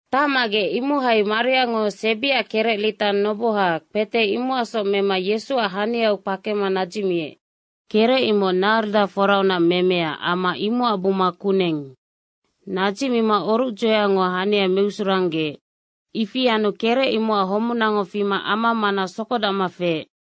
Tacmagec, imohai Mariango sebiac kerec lita noboha, kpete imocacsoc mema Yesuac haniau kpakema nadzicmiec. Kerec, imoc narda foraunac memea amma imocac buma kuneng. Nadzicmima orucdzoeango hania meusuranggeec. Ifi anu kerec imocac homunango fima ama mana sokodacma feec.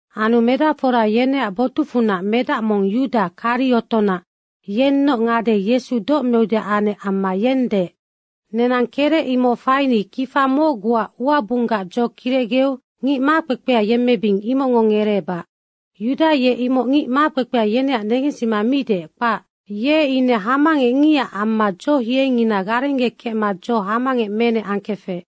Anu medacfora yeneac botucfunac medac mong Yuda Kariotonac, yennoc ngade Yesu doc meudeac anec amma yeng deec, “Nenang kerec imoc faini kifa mocguac uabunggac dzo kirecgeu ngic makpekpea yemmebing, imocngo ngereebac.” Yuda ye imoc ngic makpekpea yeneac negensima mi deec, kpac. Ye ine hamangecngicac amma dzohiengina garenggekecma dzo hamangec menec angkefec.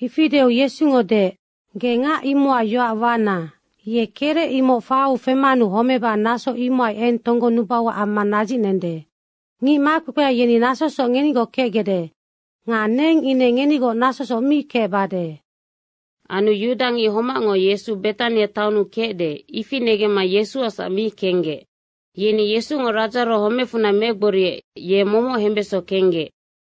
Ifi deu Yesungo deec, “Ge ngac imocac yoac wana. Ye kerec imoc faiu femanu homeba naso imohai eng tonggonubauac amma nadzicnende. Ngic makpekpea yeni nasosoc ngenigoc kecgecde nga neng ine ngenigoc nasosoc mi kecbade.” Anu yudangic homacngo Yesungo Betania taonnu kecde, ifi negemma Yesuacsac mi kenggec. Yeni Yesungo Radzaro homecfunac megboriec, ye momoc hembeso kenggec.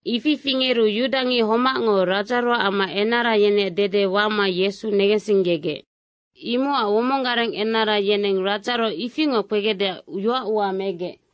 Ifi fingeru yudangic homacngo Radzaroac amma enara yeneac dede wama Yesu negensinggegec. Imocac womong gareng enara yeneng Radzaro ifingoc kpegecdeac yoacua megec.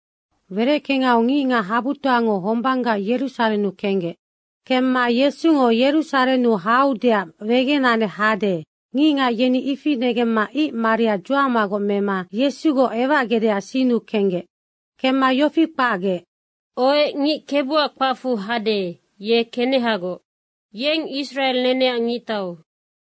Wereckengau ngicngac habutoango hombanggac Yerusarennu kenggec. Kemma Yesungo Yerusarennu haudeac wegenanec hade, ngicngac yeni ifi negemma ic maria dzuamagoc mema Yesugoc ewacgecdeac sinnu kenggec. Kemma yofi kpacgec, “Ohec, ngic KEBUAC kpacfu hade, ye kenehagoc. Yeng Israe neneac Ngictau.”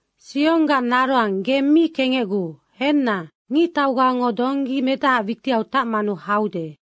“Sionggac naroang ge mi kengecguu. Henna, ngictaugango donggi medahaac witiau tacmanu haude.”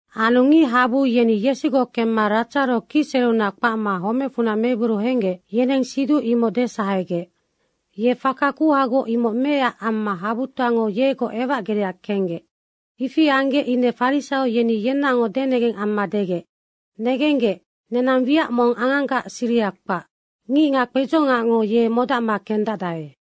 Anu ngichabu yeni Yesugoc kemma Radzaro kicsereunac kpacma homecfunac megboriu henggec, yeneng siduc imoc desahegec. Ye faka kuhagoc imoc meecac amma habutoango yegoc ewacgecdeac kenggec. Ifi anggec ine farisaio yeni yenaocngoc denengeng amma degec, “Negenggec, nenang wiac mong anganggac siriha kpac. Ngicngac kpedzongacngo ye modacma kendacdae.”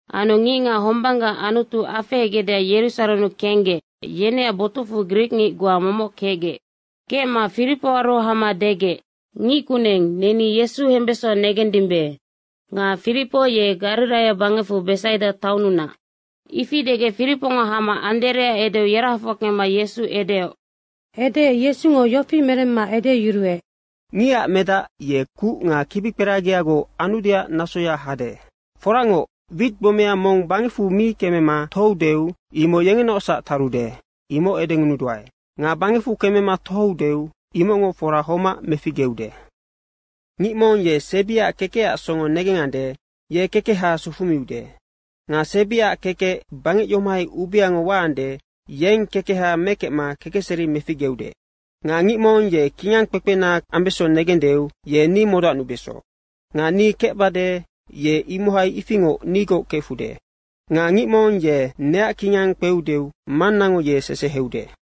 Anu ngicngac hombanggac Anutu afehegecdeac Yerusarennu kenggec, yeneac botucfu grikngic goa momoc kecgec. Kecma Firipoaru hama degec, “Ngickuneng, neni Yesu hembeso negendimbe.” nga Firipo ye Gariraia bangec Besaida taonnunac. Ifi degec Firipongo hama Anderea edeu yerahafoc kemma Yesu edeoc. Edeec Yesungo yofi meremma edeyuruec, “Ngicac medac ye kuc nga kibikperagiagoc anudeac nasoya hade. Foracngoc, wit gbomea mong bangecfu mi kemema tohoudeu imoc yengenaocsac tarude, imoc edengunuduae. Nga bangecfu kemema tohoudeu imocngo fora homac meficgeude. Ngic mong ye sebiaac kekecac songo negengande, ye kekeha sufumiude. Nga sebiaac kekec bangec yomohai ubeango waande, yeng kekeha mekecma kekecseri meficgeude. Nga ngic mong ye kingang kpekpena ambeso negendeu ye ni modacnubeso. Nga ni kecbade, ye imohai ifingoc nigoc kefude. Nga ngic mong ye neac kingang kpeudeu, Mannango ye seseheude.”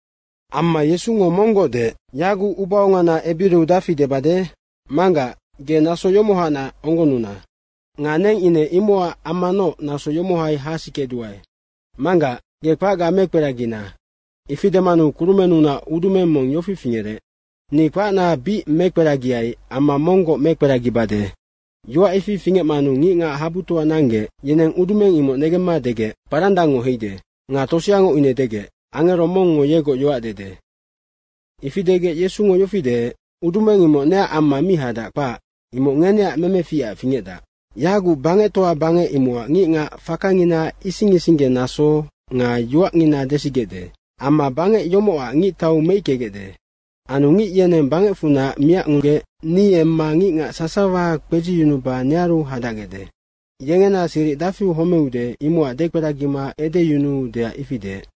Amma Yesungo monggoc deec, “Yaguc ubaongana ebiriu dafi debade? Manggac, ge naso yomohacnac onggonnuna. Nga neng ine imocac ammanoc naso yomohai hasikeduae. Manggac, ge kpacga mekperagina.” Ifi demanu kurumennunac udumeng mong yofi fingerec, “Ni kpacna bic mekperagiai amma monggoc mekperagibade.” Yoac ifi fingecmanu ngicngac habutoa nanggec, yeneng udumeng imoc negemma degec, “Parandangngo heide.” Nga toseango ine degec, “Angero mongngo yegoc yoac dede.” Ifi degec Yesungo yofi deec, “Udumeng imoc neac amma mi hadac, kpac. Imoc ngeneac memeficac fingecdac. Yaguc bangectoa bangec imocac ngicngac fakangina ising isinggenaso nga yoacngina desigecde. Amma bangec yomocac ngictau meickegecde. Anu ngic yeneng bangecfunac miacnugec ni emma ngicngac sasawa kpedziyunuba nearu hadacgecde.” Yengena siric dafiu homeude, imocac dekperagima edeyunuudeac ifi deec.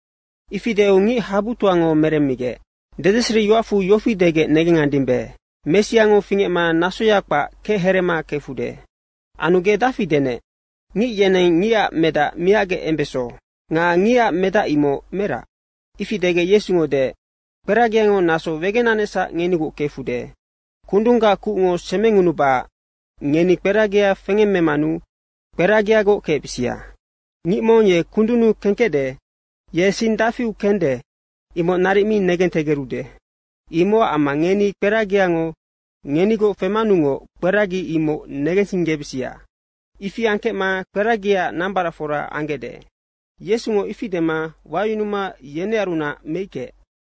Ifi deu ngic habutoango meremmigec, “Dedeseriyoacfu yofi degec negengandimbe, ‘Messiango fingecma nasoya kpac, kechereema kefude.’ Anu ge dafi denec, ‘Ngic yeneng Ngicac Medac miacgec embeso.’ Nga Ngicac Medac imoc merac?” Ifi degec Yesungo deec, “Kperagingo naso wegenanecsac ngenigoc kefude. Kundunggac kucngo semengunubacac ngeni kperagi fengemmemanu kperagigoc kecbisia. Ngic mong ye kundunnu kengkecde, ye sing dafiu kende, imoc naric mi negentegerude. Imocac amma ngeni kperagingo ngenigoc femanungoc kperagi imoc negensinggebisia. Ifi angkecma kperagiac nambaracfora anggecde.” Yesungo ifi dema wayunuma yenearunac meickeec.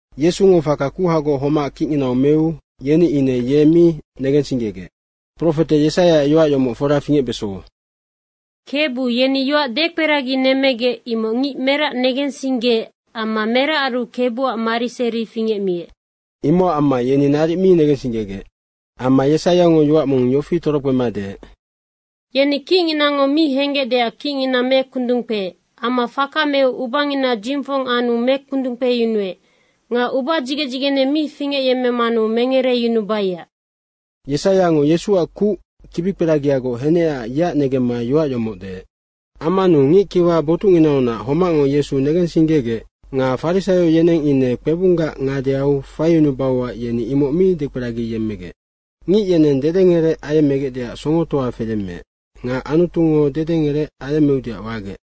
Yesungo faka kuhagoc homac kicnginau meu yeni ine ye mi negensinggegec. Profete Yesaiaac yoac yomoc fora fingecbeso, “Kebu, yeni yoac dekperaginemmegec, imoc ngic merac negensinggeec amma meracaru KEBUAC mariseri fingecmiec.” Imocac amma yeni naric mi negensinggegec. Amma Yesaiango yoac mong yofi torokpema deec, “Yeni kicnginango mi henggecdeac kicngina mekundung kpeec amma faka meu ubangina dzingfong anu mekundung kpeyunuec nga ubadzigec dzigene mi fingecyemmemanu mengereyunubaiac.” Yesaiango Yesuac kuc kibikperagiagoc henecac yeac negemma yoac yomoc deec. Ammanu ngickiwa botucnginaunac homacngo Yesu negensinggegec nga farisaio yeneng ine kpebunggac ngadeau faiyunubauac yeni imoc mi dekperagiyemmegec. Ngic yeneng dedengerec ayemmegecdeac songotoa feyemmeec nga Anutungo dedengerec ayemmeudeac wagec.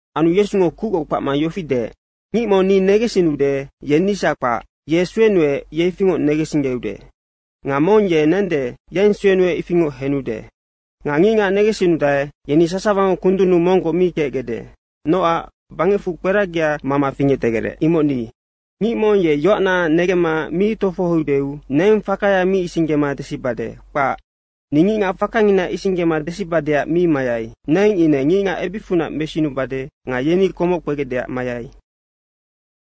Anu Yesungo kucgoc kpacma yofi deec, “Ngic mong ni negensinnude, ye nisac kpac, ye suenuec, ye ifingoc negensinggeude. Nga mong ye nende, yeng suenuec ifingoc henude. Nga ngicngac negensinnudae, yeni sasawango kundunnu monggoc mi kecgecde nocac bangecfu kperagia mama fingectegerec, imoc ni. Ngic mong ye yoacna negemma mi tofohoudeu neng fakaya mi isinggema desibade, kpac. Ni ngicngac fakangina isinggema desibadeac mi mayai. Neng ine ngicngac ebicfunac mesiyunubade nga yeni komoc kpegecdeac mayai.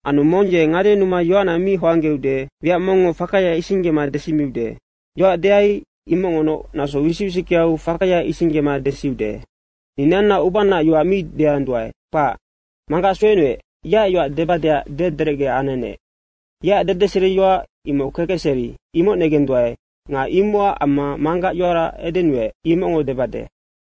Anu mong ye ngadenuma yoacna mi hoanggeude, wiac mongngo fakaya isinggema desimiude. Yoac deai, imocngonoc naso wisic wisickeau fakaya isinggema desiude. Ni neanna ubanaac yoac mi deanduae, kpac. Manggac suenuec, yeac yoac debadeac dederecge anenec. Yeac dedeseriyoac imoc kekecseri, imoc negenduae nga imocac amma Manggac yoara edenuec, imocngoc debade.”